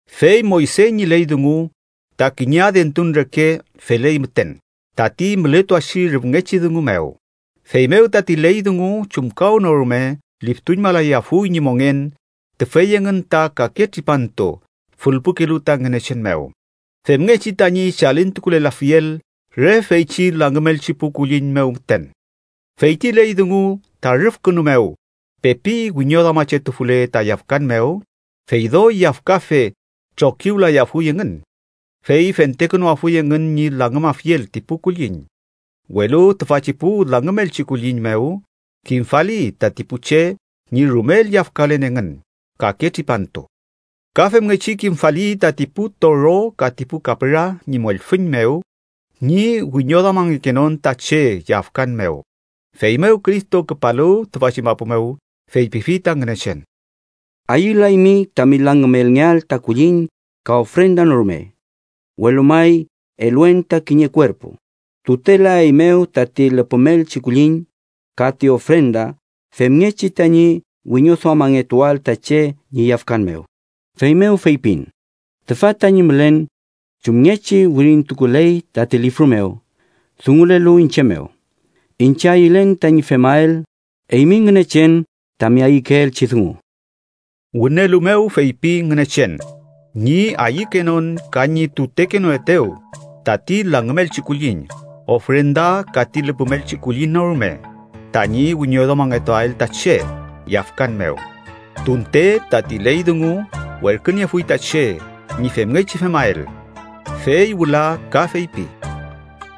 Fey Moyse ñi ley dungu ta kiñe adentun reke feley müten tati mületuachi rüfngechi dungu mew. Feymew tati ley dungu chumkawnorume liftuñmalayafuy ñi mongen tüfey engün ta kake tripantu fülpukelu ta Ngünechen mew femngechi tañi chalintukulelafiel re feychi langümelchi pu kulliñ mew müten. Fey ti ley dungu ta rüfkünu mew pepi wiñoduamachetufule ta yafkan mew, fey doy yafkafe trokiwlayafuy engün, fey fentekünuafuy engün ñi langümafiel ti pu kulliñ. Welu tüfachi pu langümelchi kulliñ mew kimfali tati pu che ñi rumel yafkalen engün kake tripantu. Ka femngechi kimfali tati pu toro ka ti pu kapüra ñi mollfüñ mew ñi wiñoduamangekenon ta che yafkan mew. Feymew Cristo küpalu tüfachi mapu mew, feypifi ta Ngünechen: “Ayülaymi tami langümelngeael ta kulliñ ka ofrenda no rume, welu may eluen ta kiñe kuerpu. Tutelaeymew tati lüpümelchi kulliñ ka ti ofrenda femngechi tañi wiñoduamangetuael ta che ñi yafkan mew. Feymew feypin: Tüfa tañi mülen, chumngechi wirintukuley tati lifru mew dungulelu iñche mew. Iñche ayülen tañi femael, eymi Ngünechen, tami ayükeelchi dungu.” Wünelu mew feypi Ngünechen ñi ayükenon ka ñi tutekenoetew tati langümelchi kulliñ, ofrenda, ka ti lüpümelchi kulliñ no rume tañi wiñoduamangetuael ta che yafkan mew, tunte tati ley dungu werküniefuy ta che ñi femngechi femael. Fey wüla ka feypi: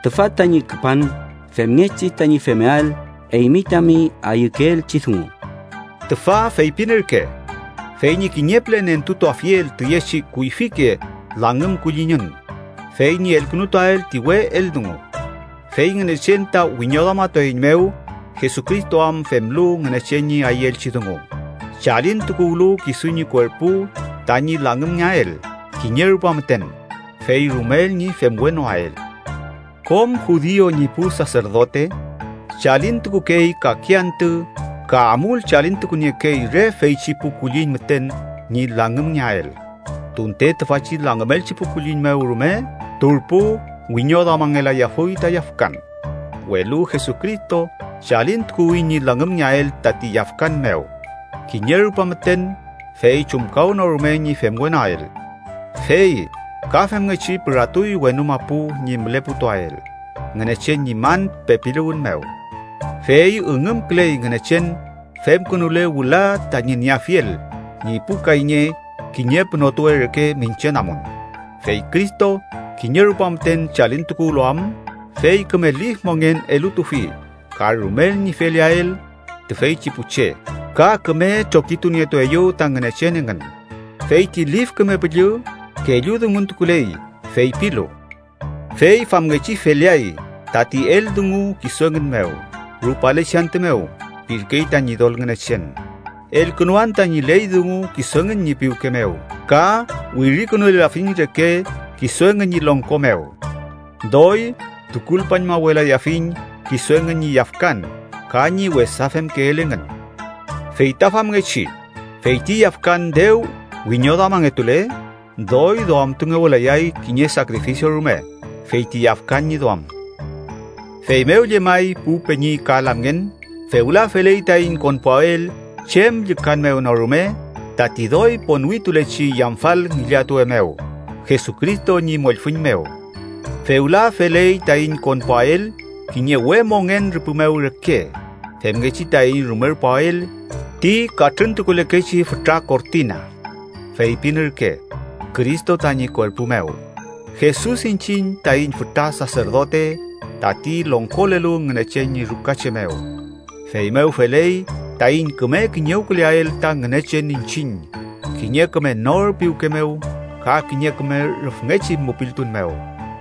“Tüfa tañi küpan femngechi tañi femael eymi tami ayükeelchi dungu.” Tüfa feypin ürke: fey ñi kiñe püle nentutuafiel tüyechi kuyfike langümkulliñün, fey ñi elkünutuael ti we eldungu. Fey Ngünechen ta wiñoduamatueiñmew, Jesucristo am femlu Ngünechen ñi ayüelchi dungu, chalintukuwlu kisu ñi kuerpu tañi langümngeael kiñe rupa müten, fey rumel ñi femwenoael. Kom judiu ñi pu saserdote chalintukukey kake antü ka amul chalintukuniekey re feychi pu kulliñ müten ñi langümngeael, tunte tüfachi langümelchi pu kulliñ mew rume turpu wiñoduamangelayafuy ta yafkan. Welu Jesucristo chalintukuwi ñi langümngeael tati yafkan mew kiñe rupa müten, fey chumkawnorume ñi femwenoael, fey ka femngechi püratuy wenu mapu ñi müleputuael Ngünechen ñi man pepiluwün mew. Fey üngümküley Ngünechen femkünule wüla tañi nieafiel ñi pu kayñe kiñe pünotuwe reke miñche namun. Fey Cristo kiñe rupa müten chalintukuwlu am fey küme lif mongen elutufi ka rumel ñi feleael tüfeychi pu che ka küme trokitunietueyew ta Ngünechen engün. Fey ti Lif Küme Püllü kelludunguntukuley feypilu: “Fey famngechi feleay tati eldungu kisu engün mew rupalechi antü mew, pirkey ta Ñidol Ngünechen: Elkünuan tañi ley dungu kisu engün ñi piwke mew ka wirikünulelafiñ reke kisu engün ñi longko mew. Doy tukulpañmawelayafiñ kisu engün ñi yafkan ka ñi wesa femkeel engün.” Fey ta famngechi, fey ti yafkan dew wiñoduamangetule, doy duamtungewelayay kiñe sakrifisio rume fey ti yafkan ñi duam. Feymew llemay, pu peñi ka lamngen, fewla feley taiñ konpuael chem llükan mew no rume tati doy ponwitulechi yamfal ngillatuwe mew Jesucristo ñi mollfüñ mew. Fewla feley taiñ konpuael kiñe we mongen rüpü mew reke femngechi taiñ rumerpuael ti katrüntukulekechi fütra kortina, feypin ürke: Cristo tañi kuerpu mew. Jesus iñchiñ taiñ fütra saserdote tati longkolelu Ngünechen ñi rukache mew. Feymew feley taiñ küme kiñewküleael ta Ngünechen iñchiñ kiñe küme nor piwke mew ka kiñe küme rüfngechi mupiltun mew,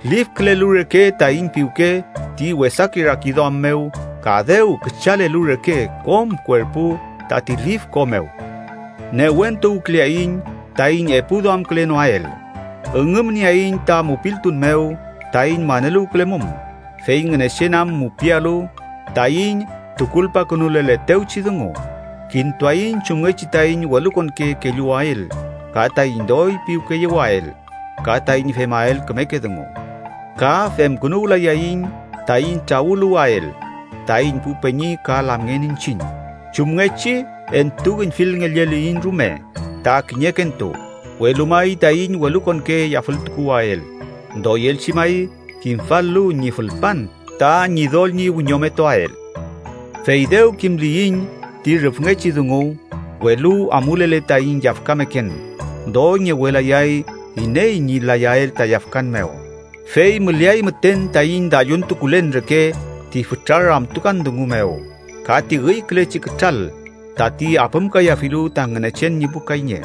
lifkülelu reke taiñ piwke ti wesake rakiduam mew ka dew küchalelu reke kom kuerpu tati lif ko mew. Newentuwküleaiñ taiñ epu duamkülenoael. Üngümnieaiñ ta mupiltun mew taiñ maneluwkülemum, fey Ngünechen am mupialu taiñ tukulpakünuleletewchi dungu. Kintuaiñ chumngechi taiñ welukonke kelluwael ka taiñ doy piwkeyewael ka taiñ femael kümeke dungu. Ka femkünuwlayaiñ taiñ trawüluwael, taiñ pu peñi ka lamngen iñchiñ, chumngechi entuüñfilngelleliyiñ rume ta kiñekentu, welu may, taiñ welukonke yafültukuwael, doyelchi may, kimfal-lu ñi fülpan ta Ñidol ñi wiñometuael. Fey dew kimliyiñ ti rüfngechi dungu, welu amulele taiñ yafkameken, doy ngewelayay iney ñi layael ta yafkan mew. Fey müleay müten taiñ dalluntukulen reke ti fütra ramtukan dungu mew ka ti üykülechi kütral tati apümkayafilu ta Ngünechen ñi pu kayñe.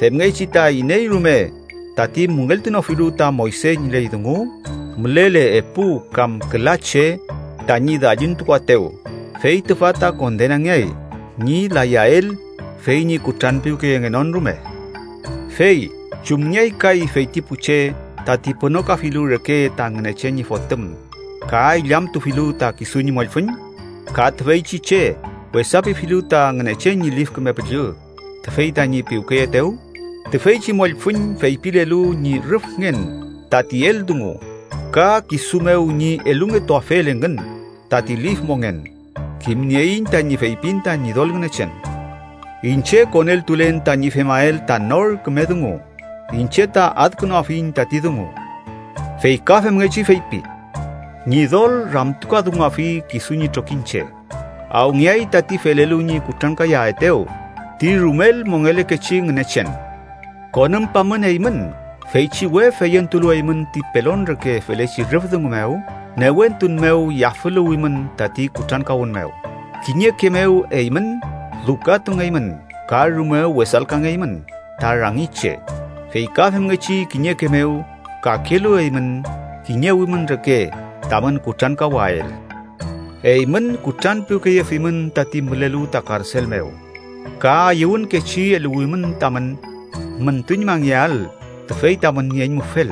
Femngechi ta iney rume tati müngeltunofilu ta Moyse ñi ley dungu, mülele epu kam küla che tañi dalluntukuaetew, fey tüfa ta kondenangeay ñi layael fey ñi kutranpiwkeyengenon rume. Fey, ¿chumngeay kay feyti pu che tati pünokafilu reke ta Ngünechen ñi Fotüm, ka illamtufilu ta kisu ñi mollfüñ? ¿Ka tüfeychi che wesapifilu ta Ngünechen ñi Lif Küme Püllü tüfey tañi piwkeyeetew? Tüfeychi mollfüñ feypilelu ñi rüfngen tati eldungun ka kisu mew ñi elungetuafel engün tati lif mongen. Kimnieiñ tañi feypin ta Ñidol Ngünechen: “Iñche koneltulen tañi femael ta nor küme dungu. Iñche ta adkünuafiñ tati dungu. Fey ka femngechi feypi: Ñidol ramtukadunguafi kisu ñi trokiñche.” ¡Awngeay tati felelu ñi kutrankayaetew ti rumel mongelekechi Ngünechen! Konümpamün eymün, feychi we feyentulu eymün ti pelon reke felechi rüf dungu mew, newentun mew yafüluwimün tati kutrankawün mew. Kiñeke mew eymün lukatungeymün ka rume wesalkangeymün ta rangi che, fey ka femngechi kiñeke mew kakelu eymün kiñewimün reke tamün kutrankawael. Eymün kutranpiwkeyefimün tati mülelu ta karsel mew, ka ayüwünkechi eluwimün tamün müntuñmangeael tüfey tamün nieñmufel,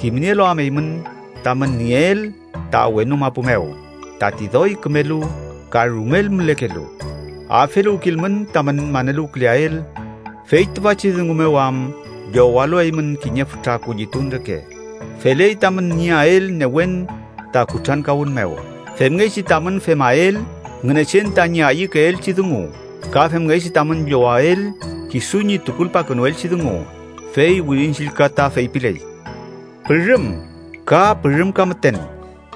kimnielu am eymün tamün nieel ta wenu mapu mew tati doy kümelu ka rumel mülekelu. Afeluwkilmün tamün maneluwküleael, fey tüfachi dungu mew am llowalu eymün kiñe fütra kullitun reke. Feley tamün nieael newen ta kutrankawün mew, femngechi tamün femael Ngünechen tañi ayükeelchi dungu ka femngechi tamün llowael kisu ñi tukulpakünuelchi dungu. Fey Wirin Chillka ta feypiley: “Pürüm, ka pürümka müten,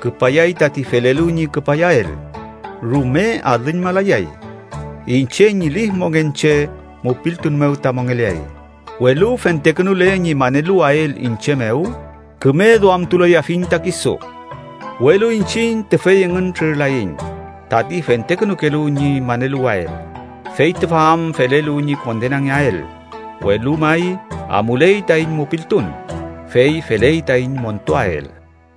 küpayay tati felelu ñi küpayael. Rume alüñmalayay. Iñche ñi lif mongen che mupiltun mew ta mongeleay. Welu fentekünule ñi maneluwael iñche mew, küme duamtulayafiñ ta kisu.” Welu iñchiñ tüfey engün trürlaiñ tati fentekünukelu ñi maneluwael, fey tüfa am felelu ñi kondenangeael, welu may amuley taiñ mupiltun, fey feley taiñ montuael.